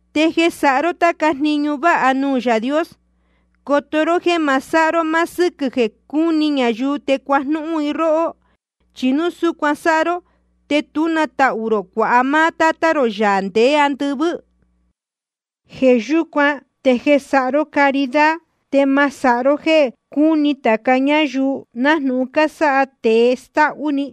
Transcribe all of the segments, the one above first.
’Te jeē sáha ró táca jniñu váha nuū Yaā Dios, coto ró jéē ma sáha ró máá sɨ́quɨ̄ jeē cúni ñayuu te cuajnúhún i róhó. Chi núu súcuan sáha ró, te tú na tahū rō cuāha máá Tátá rō, Yaā ndeé andɨvɨ́. Jeē yúcuan te jeē sáha ró caridad, te ma sáha ró jéē cúni tāca ñáyuu, nájnūhun cásáha tēe stáhú‑ni,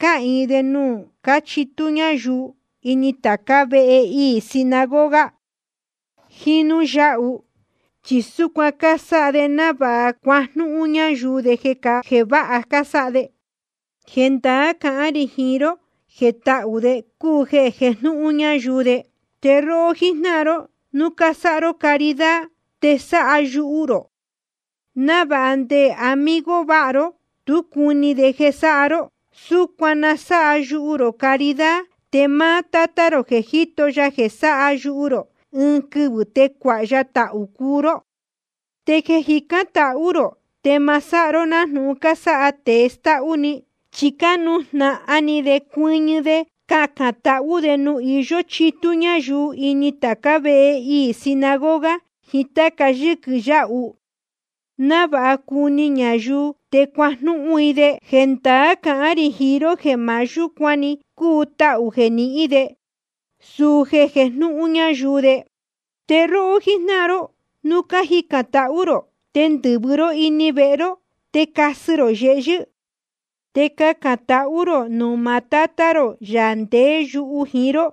cáhīin de nuū cúchitú ñayuu ini tācá vehe iī sinagoga jiín núū yáhu. Chi súcuan cásáha de návāha cuajnúhún ñayuu de jeē váha cásáha de. Jendaá cahán rī jiín ró jeē tahū de cúu jeē jejnúhún ñayuu de. Te róhó jíjnáhan ró, núu cásáha ró caridad, te sáha yuhu rō, návāha nde amigo vāha ró tú cuni jeē sáha ró. Súcuan na sáha yuhu rō caridad. Te máá Tátá rō jeē jíto ya jeē sáha yuhu rō, ɨɨn quɨvɨ̄ te cuāha ya tahū cuu ró. ’Te jeē cájicān tahú rō, te ma sáha ró nájnūhun cásáha tēe stáhú‑ni. Chi cánujnahan ni de cuɨñɨ de cacān tahú de nuū iyó chitú ñayuu ini tācá vehe iī sinagoga jiín táca yɨ́quɨ yáhu, návāha cuni ñayuu te cuajnúhún i de. Jendaá cahán rī jiín ró jeē maá yúcuan‑ni cúu tahū jeē nihín de, suu jeē jejnúhún ñayuu de. Te róhó jíjnáhan ró, núu cájicān tahú rō, te ndɨ̄vɨ ró ini vehe ró te casɨ rō yehyɨ́. Te cacān tahú rō nuū maá Tátá rō, Yaā ndeé yuhu jiín ró.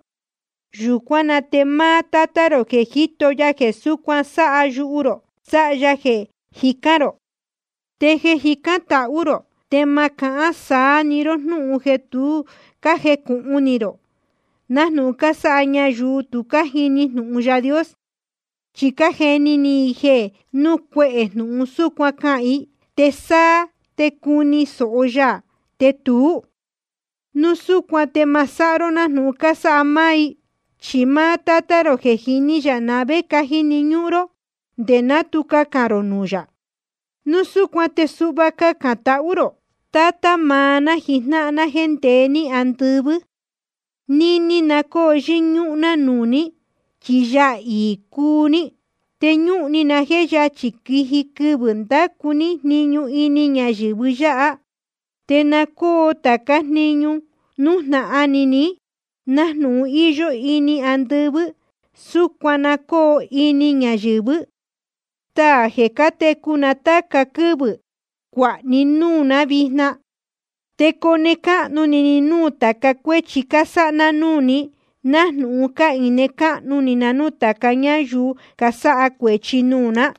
Yūcuán na te máá Tátá rō jeē jíto ya jeē súcuan sáha yuhu rō, sáha ya jeē jicán rō. ’Te jeē cájicān tahú rō, te ma cahán saá‑ni ró jnúhun jeē tu cájecūhun ni rō, nájnūhun cásáha ñayuu tu cájini jnūhun Yaā Dios. Chi cájeni ni i jeē núu cuehē jnūhun súcuan cahān i, te sáá te cuni sōho ya, te tuú. Núu súcuan te ma sáha ró nájnūhun cásáha máá i. Chi máá Tátá rō, je jíní yā na vé cájini ñúhún ró nde ná tu cacān rō nuū yā. Núu súcuan te suhva cacān tahú rō: Tátá maá ná jijnáhan ná jéē ndeé ní andɨvɨ́, níní na cóo yɨ́ñúhún ná nuū ní, chi Yaā iī cúu ní. Te ñúhun ni na jéē yachī quiji quɨvɨ̄ ndacu ní jniñu nɨ́ɨ́ ñáyɨ̄vɨ yáha. Te na cóo tācá jniñu nújnahan ni ní, nájnūhun íyó ini andɨvɨ́, súcuan na cóo ini ñayɨ̄vɨ́. Staā jeē cátecu na táca quɨ́vɨ̄, cuāha ní núū ná vijna. Te cone cahnu ni ni núū tāca cuéchi cásáha ná núū ní, nájnūhun cáhine cáhnu ni na núū ñáyuu casáha cuēchi nuū ná.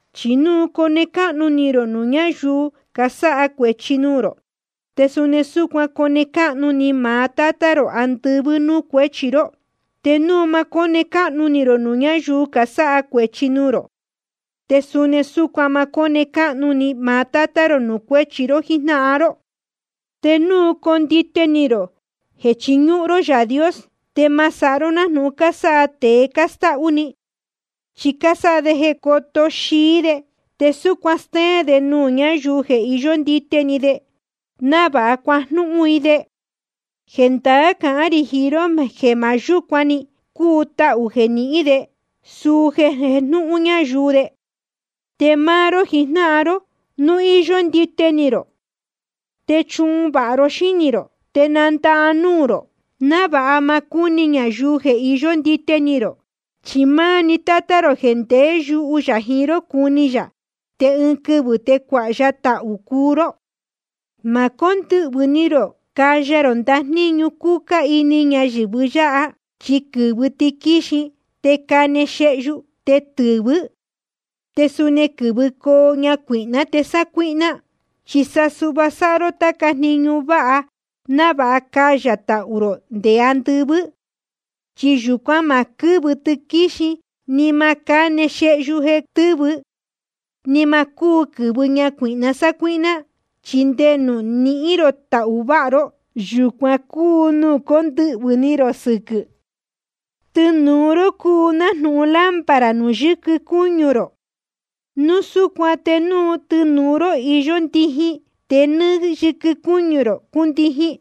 ’Chi núu cone cáhnu ni rō nuū ñáyuu casáha cuēchi nuū rō, te suni súcuan cone cáhnu ni maá Tátá rō andɨvɨ́ nuū cuéchi ró. Te núu ma cóne cáhnu ni rō nuū ñáyuu casáha cuēchi nuū rō, te suni súcuan ma cóne cáhnu ni maá Tátá rō nuū cuéchi ró jíjnáhan ró. ’Te núu condite ni rō jeē chiñúhún ró Yaā Dios, te ma sáha ró nájnūhun cásáha tēe stáhú‑ni. Chi cásáha de jeē coto xií de, te súcuan stéén de nuū ñayuu jeē iyó ndite ni de, návāha cuajnúhún i de. Jendaá cahán rī jiín ró jeē maá yúcuan‑ni cúu tahū jeē nihín de, suu jeē jejnúhún ñayuu de. Te máá ró jijnáhan ró, núu íyó ndite ni rō, te sa chuhun vāha ró xínī rō te nandahá núū rō, návāha ma cúni ñayuu jeē iyó ndite ni rō. Chi máá‑ni Tátá rō jeē ndeé yuhu yā jiín ró, cuni yā, te ɨɨn quɨvɨ̄ te cuāha ya tahū cuu ró. ’Ma cóndɨhvɨ̄ ni rō caya rō ndajníñu cúcá ini ñayɨ̄vɨ yáha, chi quɨ́vɨ tiquíxin, te cáne xehyu, te tɨ́vɨ. Te suni quɨ́vɨcoo ñacuīhná te sácuíhná. Chi sa suhva sáha ró táca jniñu váha návāha cayā tahū rō nde andɨvɨ́. Chi yūcuan má quɨ́vɨ tiquíxin ni ma cáne xehyu jeē tɨ́vɨ. Ni ma cúu quɨ̄vɨ ñacuīhna sácuíhná. Chi nde nuū nihín rō tahū váha ró, yūcuan cúu nuū cóndɨhvɨ̄ ni rō sɨquɨ̄. ’Tɨnūu ró cúu nájnūhun lámpara nuū yɨquɨ cúñu rō. Núu súcuan te núu tɨnūu ró íyó ndijin, te nɨ́ɨ́‑ni yɨquɨ cúñu rō cúndijin.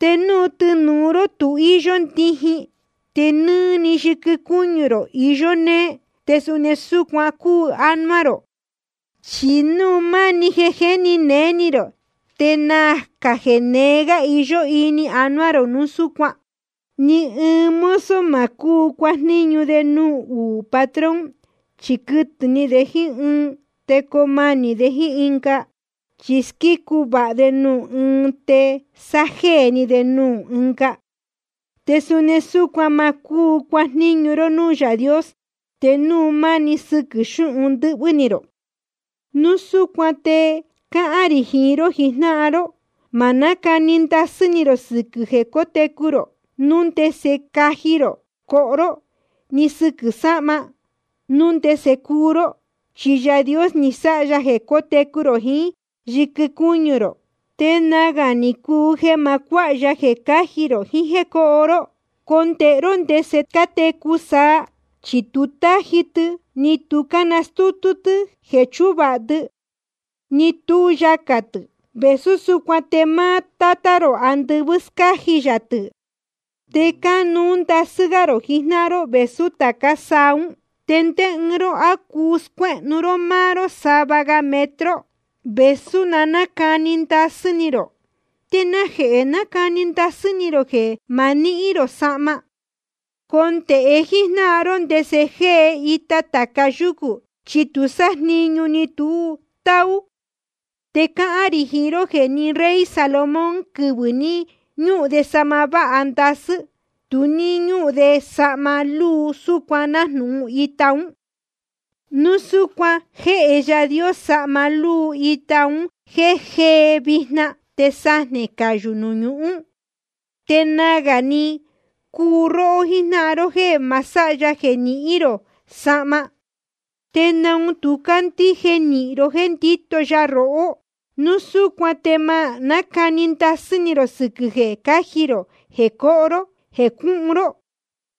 Te núu tɨnūu ró tu íyó ndijin, te nɨ́ɨ́‑ni yɨquɨ cúñu rō iyó nee. Te suni súcuan cúu ánuá rō, chi núu máni jeē jéni néé ni rō, te nacā jeē nee gā iyó ini anuá rō núu súcuan. ’Ni ɨɨn mozo ma cúu cuajníñu de nuū uū patrón. Chi quɨtɨ̄ ni de nuū ɨɨn te coo manī de jíín ɨnga, chí squícu vāha de nuū ɨɨn te sájéē ni de nuū ɨnga. Te suni súcuan ma cúu cuajníñu ró núū Yaā Dios te núu máni sɨquɨ̄ xúhun ndɨ́hvɨ́ ni rō. ’Núu súcuan te cáhán rī jiín ró jijnáhan ró: Ma nácani ndasɨ́ ni rō sɨquɨ̄ jeē cótecu rō, núu ndese caji rō coho ró, ni sɨquɨ̄ sahma, núu ndese cuhun ró. Chi Yaā Dios ni sáha ya jeē técu rō jiín yɨquɨ cúñu rō, te nagā ni cuu jeē ma cuáha ya jeē cáji rō jiín jéē cúhun ró. Condēhe ró ndese cátecu saa, chi tu cátaji tɨ, ni tu cánastútú tɨ́ jeē chúvāha tɨ, ni tú yacā tɨ̄. Te vēsú súcuan te máá Tátá rō andɨvɨ́ scáji yā tɨ̄. Te cánuú ndasɨ́ gá rō jijnáhan ró vēsú tācá saa ún. ¿Te ndé ɨɨn ró, á cuu scuéhnu ró máá ró sava metro gā, vēsú na nácani ndasɨ́ ni rō? ’¿Te najehē cánacani ndasɨ́ ni rō jeē ma nihín rō sahma? Condēhe jíjnáhan ró ndese jée ita tāca yúcū. Chi tu sájniñu, ni tu táú. Te cáhán rī jiín ró jeē ni rey Salomón, quɨvɨ̄ ní ñúhun de sahma váha ndasɨ́, tu ní ñúhun de sahma lúu súcuan nájnūhun ita ún. Te núu súcuan jéhe Yaā Dios sahma lúu ita un jéē jée vijna te sajnē cayū nuū ñuhún, te nagā ni cuu róhó jíjnáhan ró jéē ma sáha ya jeē nihín rō sahma. ¿Te naun tu cácandíje nīhin ró jéē ndíto ya rohó? Núu súcuan te ma nácani ndasɨ́ ni rō sɨquɨ̄ jeē cáji rō, jeē coho ró, jeē cuhun ró.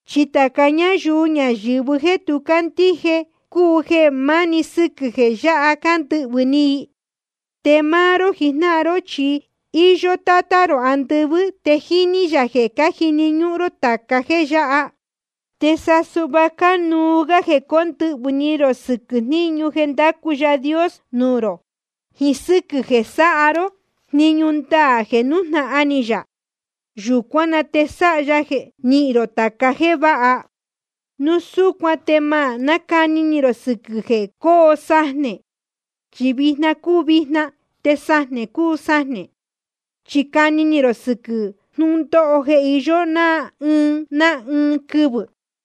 Chi tāca ñáyuu ñayɨ̄vɨ jéē tu cácandíje cúu jeē máni sɨquɨ̄ jeē yáha cándɨhvɨ̄ ni i. Te máá ró jijnáhan ró, chi íyó Tátá rō andɨvɨ́, te jíní yā jeē cájini ñúhún ró tāca jéē yáha. Te sa suhva cánuú gá jeē cóndɨhvɨ̄ ni rō sɨquɨ̄ jniñu jeē ndácu Yaā Dios nuū rō, jiín sɨ́quɨ̄ jeē sáha ró jniñu ndaā jeē nújnahan ni yā. Yūcuán na te sáha ya jeē nihín rō tāca jéē yáha. Núu súcuan te ma nácani ni rō sɨquɨ̄ jeē cóo sajnē, chi vijna cúu vijna te sajnē cúu sajnē. Chi cani ni rō sɨquɨ̄ jnúndóho jeē iyó ná ɨɨn ná ɨɨn‑ni quɨvɨ̄.